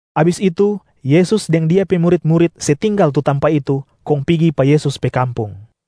Abis itu Yesus deng Dia pe murit-murit se tinggal tu tampa itu kong pigi pa Yesus pe kampung.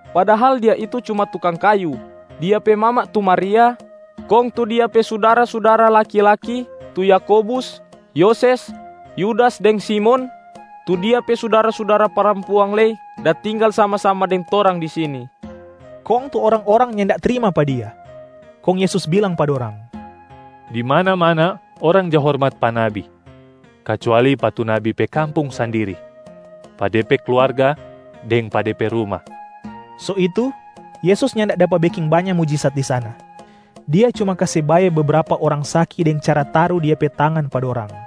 Padahal Dia itu cuma tukang kayu. Dia pe mama tu Maria, kong tu Dia pe sudara-sudara laki-laki tu Yakobus, Yoses, Yudas deng Simon. Tu Dia pe sudara-sudara parampuang lei da tinggal sama-sama deng torang di sini.” Kong tu orang-orang nyanda trima pa Dia. Kong Yesus bilang pa dorang, “Di mana-mana orang ja hormat pa nabi, kacuali pa tu nabi pe kampung sandiri, pa de pe kluarga, deng pa de pe ruma.” So itu Yesus nyanda dapa beking banya mujisat di sana, Dia cuma kase bae bebrapa orang saki deng cara taru Dia pe tangan pa dorang.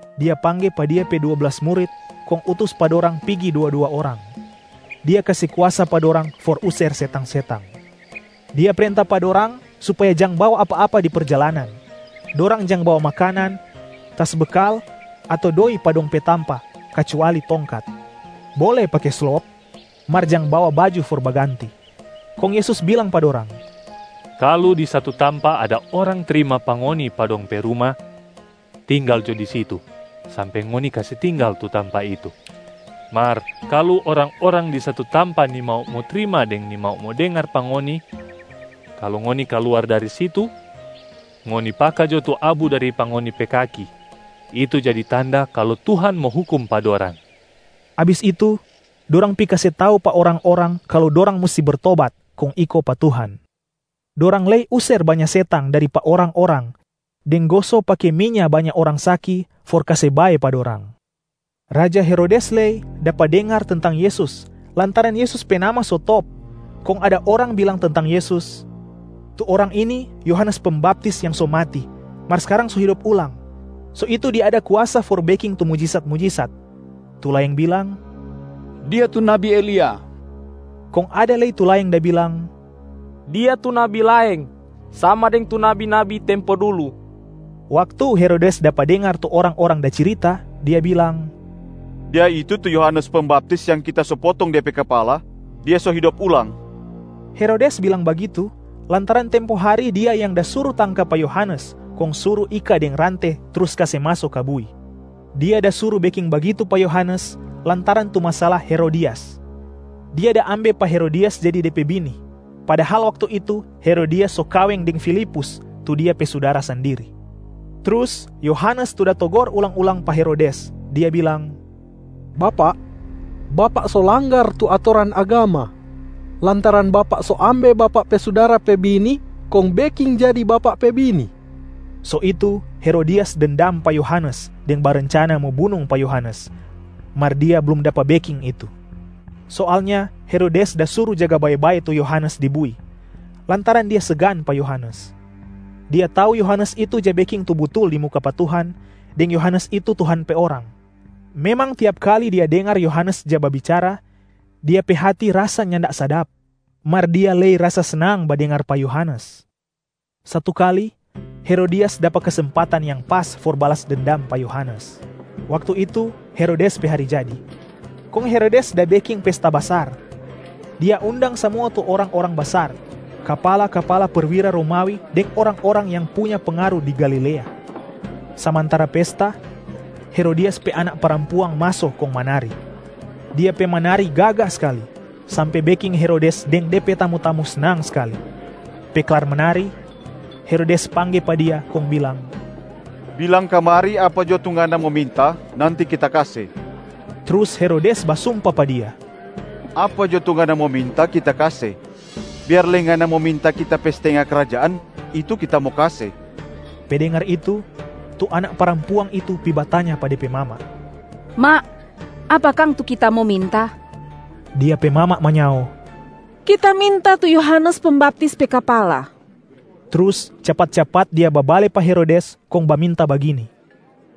Dia pangge pa Dia pe dua blas murit kong utus pa dorang pigi dua-dua orang. Dia kase kuasa pa dorang for user setang-setang. Dia prenta pa dorang supaya jang bawa apa-apa di perjalanan. Dorang jang bawa makanan, tas bekal ato doi pa dong pe tampa kacuali tongkat. Bole pake slop, mar jang bawa baju for baganti. Kong Yesus bilang pa dorang, “Kalu di satu tampa ada orang trima pa ngoni pa dong pe ruma, tinggal jo di situ sampe ngoni kase tinggal tu tampa itu. Mar kalu orang-orang di satu tampa nimau mo trima deng nimau mo dengar pa ngoni, kalu ngoni kaluar dari situ, ngoni paka jo tu abu dari pa ngoni pe kaki itu jadi tanda kalu Tuhan mo hukum pa dorang.” Abis itu dorang pi kase tau pa orang-orang kalu dorang musti bertobat kong iko pa Tuhan. Dorang lei user banya setang dari pa orang-orang deng goso pake minya banya orang saki for kase bae pa dorang. Raja Herodes lei dapa dengar tentang Yesus lantaran Yesus pe nama so top, kong ada orang bilang tentang Yesus, “Tu Orang ini Yohanes Pembaptis yang so mati mar skarang so hidop ulang, so itu Dia ada kuasa for beking tu mujisat-mujisat.” Tu laeng bilang, “Dia tu nabi Elia!” Kong ada lei tu laeng da bilang, “Dia tu nabi laeng, sama deng tu nabi-nabi tempo dulu.” Waktu Herodes dapa dengar tu orang-orang da cirita, dia bilang, “Dia itu tu Yohanes Pembaptis yang kita so potong de pe kapala, Dia so hidop ulang.” Herodes bilang bagitu, lantaran tempo hari dia yang da suru tangka pa Yohanes kong suru ika deng rante trus kase maso ka bui. Dia da suru beking bagitu pa Yohanes lantaran tu masala Herodias. Dia da ambe pa Herodias jadi de pe bini, padahal waktu itu Herodias so kaweng deng Filipus tu dia pe sudara sandiri. Trus Yohanes tu da togor ulang-ulang pa Herodes, dia bilang, “Bapak, bapak so langgar tu atoran agama, lantaran bapak so ambe bapak pe sudara pe bini kong beking jadi bapak pe bini.” So itu Herodias dendam pa Yohanes deng barencana mo bunung pa Yohanes, mar dia blum dapa beking itu. Soalnya Herodes da suru jaga bae-bae tu Yohanes di bui, lantaran dia segan pa Yohanes. Dia tau Yohanes itu ja beking tu butul di muka pa Tuhan deng Yohanes itu Tuhan pe orang. Memang tiap kali dia dengar Yohanes ja babicara, dia pe hati rasa nyanda sadap, mar dia lei rasa snang badengar pa Yohanes. Satu kali, Herodias dapa kesempatan yang pas for balas dendam pa Yohanes. Waktu itu Herodes pe hari jadi, kong Herodes da beking pesta basar. Dia undang samua tu orang-orang basar, kapala-kapala perwira Romawi deng orang-orang yang punya pengaru di Galilea. Samantara pesta, Herodias pe anak parampuang maso kong manari. Dia pe manari gaga skali, sampe beking Herodes deng de pe tamu-tamu snang skali. Pe klar manari, Herodes pangge pa dia kong bilang, “Bilang kamari apa jo tu ngana mo minta, nanti kita kase!” Trus Herodes basumpa pa dia, “Apa jo tu ngana mo minta kita kase, biar lei ngana mo minta kita pe stenga krajaan, itu kita mo kase!” Pe dengar itu, tu anak parampuang itu pi batanya pa de pe mama, “Ma, apa kang tu kita mo minta?” Dia pe mama manyao, “Kita minta tu Yohanes Pembaptis pe kapala!” Trus capat-capat dia babale pa Herodes kong baminta bagini,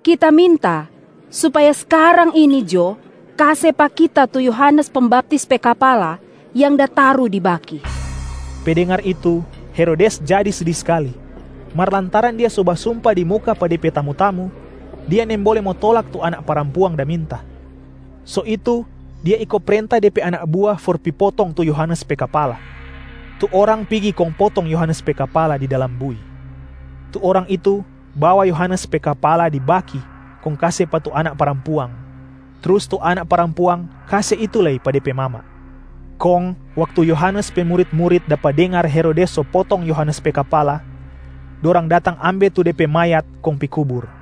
“Kita minta supaya skarang ini jo kase pa kita tu Yohanes Pembaptis pe kapala yang da taru di baki!” Pe dengar itu, Herodes jadi sedi skali. Mar lantaran dia so basumpa di muka pa de pe tamu-tamu, dia nimbole mo tolak tu anak parampuang da minta. So itu dia iko prenta de pe anak bua for pi potong tu Yohanes pe kapala. Tu orang pigi kong potong Yohanes pe kapala di dalam bui. Tu orang itu bawa Yohanes pe kapala di baki kong kase pa tu anak parampuang. Trus tu anak parampuang kase itu lei pa de pe mama. Kong waktu Yohanes pe murit-murit dapa dengar Herodes so potong Yohanes pe kapala, dorang datang ambe tu de pe mayat kong pi kubur.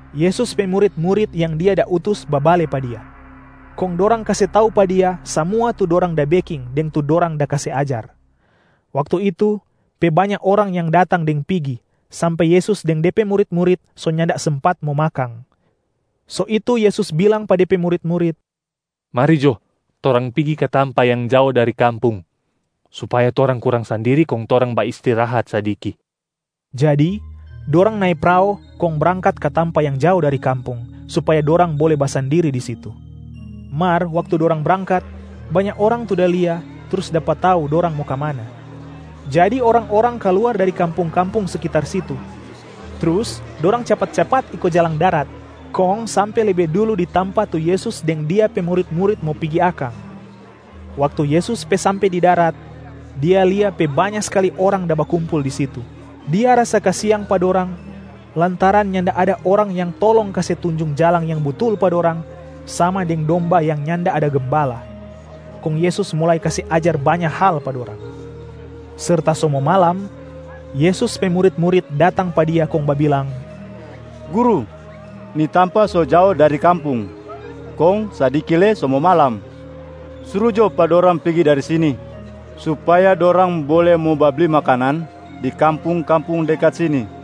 Yesus pe murit-murit yang Dia da utus babale pa Dia, kong dorang kase tau pa Dia samua tu dorang da beking deng tu dorang da kase ajar. Waktu itu, pe banya orang yang datang deng pigi, sampe Yesus deng De pe murit-murit so nyanda sempat mo makang. So itu Yesus bilang pa de pe murit-murit, “Mari jo, torang pigi ka tampa yang jao dari kampung supaya torang kurang sandiri kong torang baistirahat sadiki!” Jadi dorang nae prao kong brangkat ka tampa yang jao dari kampung, supaya dorang bole basandiri di situ. Mar waktu dorang brangkat, banya orang tu da lia trus dapa tau dorang mo kamana. Jadi orang-orang kaluar dari kampung-kampung sekitar situ, trus dorang capat-capat iko jalang darat kong sampe lebe dulu di tampa tu Yesus deng Dia pe murit-murit mo pigi akang. Waktu Yesus pe sampe di darat, Dia lia pe banya skali orang da bakumpul di situ. Dia rasa kasiang pa dorang lantaran nyanda ada orang yang tolong kase tunjung jalang yang butul pa dorang sama deng domba yang nyanda ada gembala, kong Yesus mulai kase ajar banya hal pa dorang. Serta so mo malam, Yesus pe murit-murit datang pa Dia kong babilang, “Guru, ni tampa so jao dari kampung, kong sadiki lei so mo malam. Suru jo pa dorang pigi dari sini, supaya dorang bole mo babli makanan di kampung-kampung dekat sini.”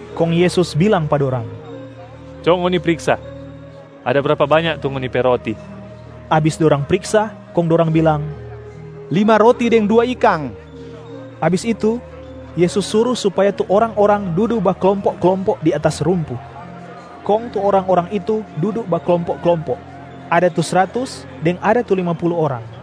Kong Yesus bilang pa dorang, “Co ngoni priksa. Ada brapa banya tu ngoni pe roti?” Abis dorang priksa kong dorang bilang, “Lima roti deng dua ikang.” Abis itu, Yesus suru supaya tu orang-orang dudu baklompo-klompo di atas rumpu. Kong tu orang-orang itu dudu baklompo-klompo, ada tu sratus deng ada tu lima pulu orang.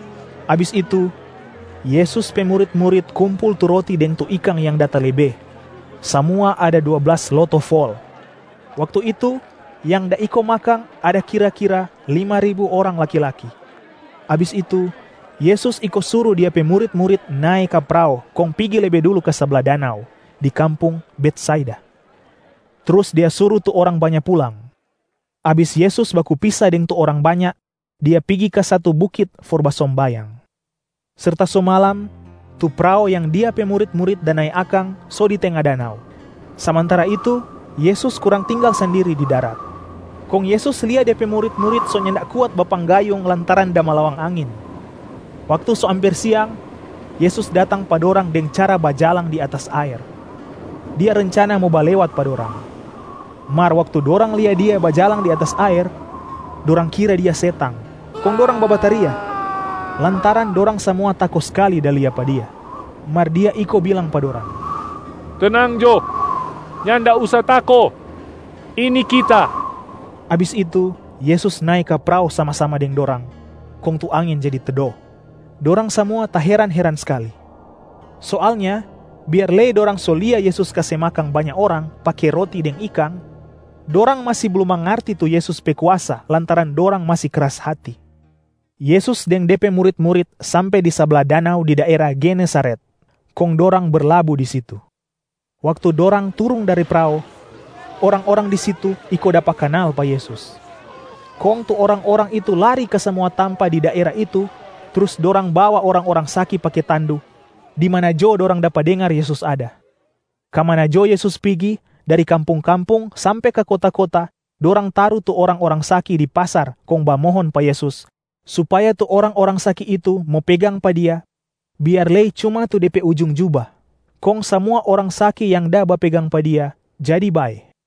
Abis itu, Yesus pe murit-murit kumpul tu roti deng tu ikang yang da talebe, samua ada dua blas loto fol. Waktu itu yang da iko makang ada kira-kira lima ribu orang laki-laki. Abis itu, Yesus iko suru Dia pe murit-murit nae ka prao kong pigi lebe dulu ka sabla danau, di kampung Betsaida. Trus Dia suru tu orang banya pulang. Abis Yesus baku pisa deng tu orang banya, Dia pigi ka satu bukit for basombayang. Serta so malam, tu prao yang Dia pe murit-murit da nae akang so di tenga danau, samantara itu Yesus kurang tinggal sandiri di darat. Kong Yesus lia De pe murit-murit so nyanda kuat bapanggayung lantaran da malawang angin. Waktu so amper siang, Yesus datang pa dorang deng cara bajalang di atas aer. Dia rencana mo balewat pa dorang. Mar waktu dorang lia Dia bajalang di atas aer, dorang kira Dia setang, kong dorang babataria lantaran dorang samua tako skali da lia pa Dia. Mar Dia iko bilang pa dorang, “Tenang jo, nyanda usa tako! Ini Kita.” Abis itu Yesus nae ka prao sama-sama deng dorang, kong tu angin jadi tedo. Dorang samua taheran-heran skali. Soalnya biar lei dorang so lia Yesus kase makang banya orang pake roti deng ikang, dorang masi blum mangarti tu Yesus pe kuasa lantaran dorang masi kras hati. Yesus deng De pe murit-murit sampe di sabla danau di daera Genesaret, kong dorang berlabu di situ. Waktu dorang turung dari prao, orang-orang di situ iko dapa kanal pa Yesus. Kong tu orang-orang itu lari ka samua tampa di daera itu trus dorang bawa orang-orang saki pake tandu, di mana jo dorang dapa dengar Yesus ada. Ka mana jo Yesus pigi, dari kampung-kampung sampe ka kota-kota dorang taru tu orang-orang saki di pasar kong bamohon pa Yesus, supaya tu orang-orang saki itu mo pegang pa Dia biar lei cuma tu De pe ujung juba. Kong samua orang saki yang da bapegang pa Dia jadi bae.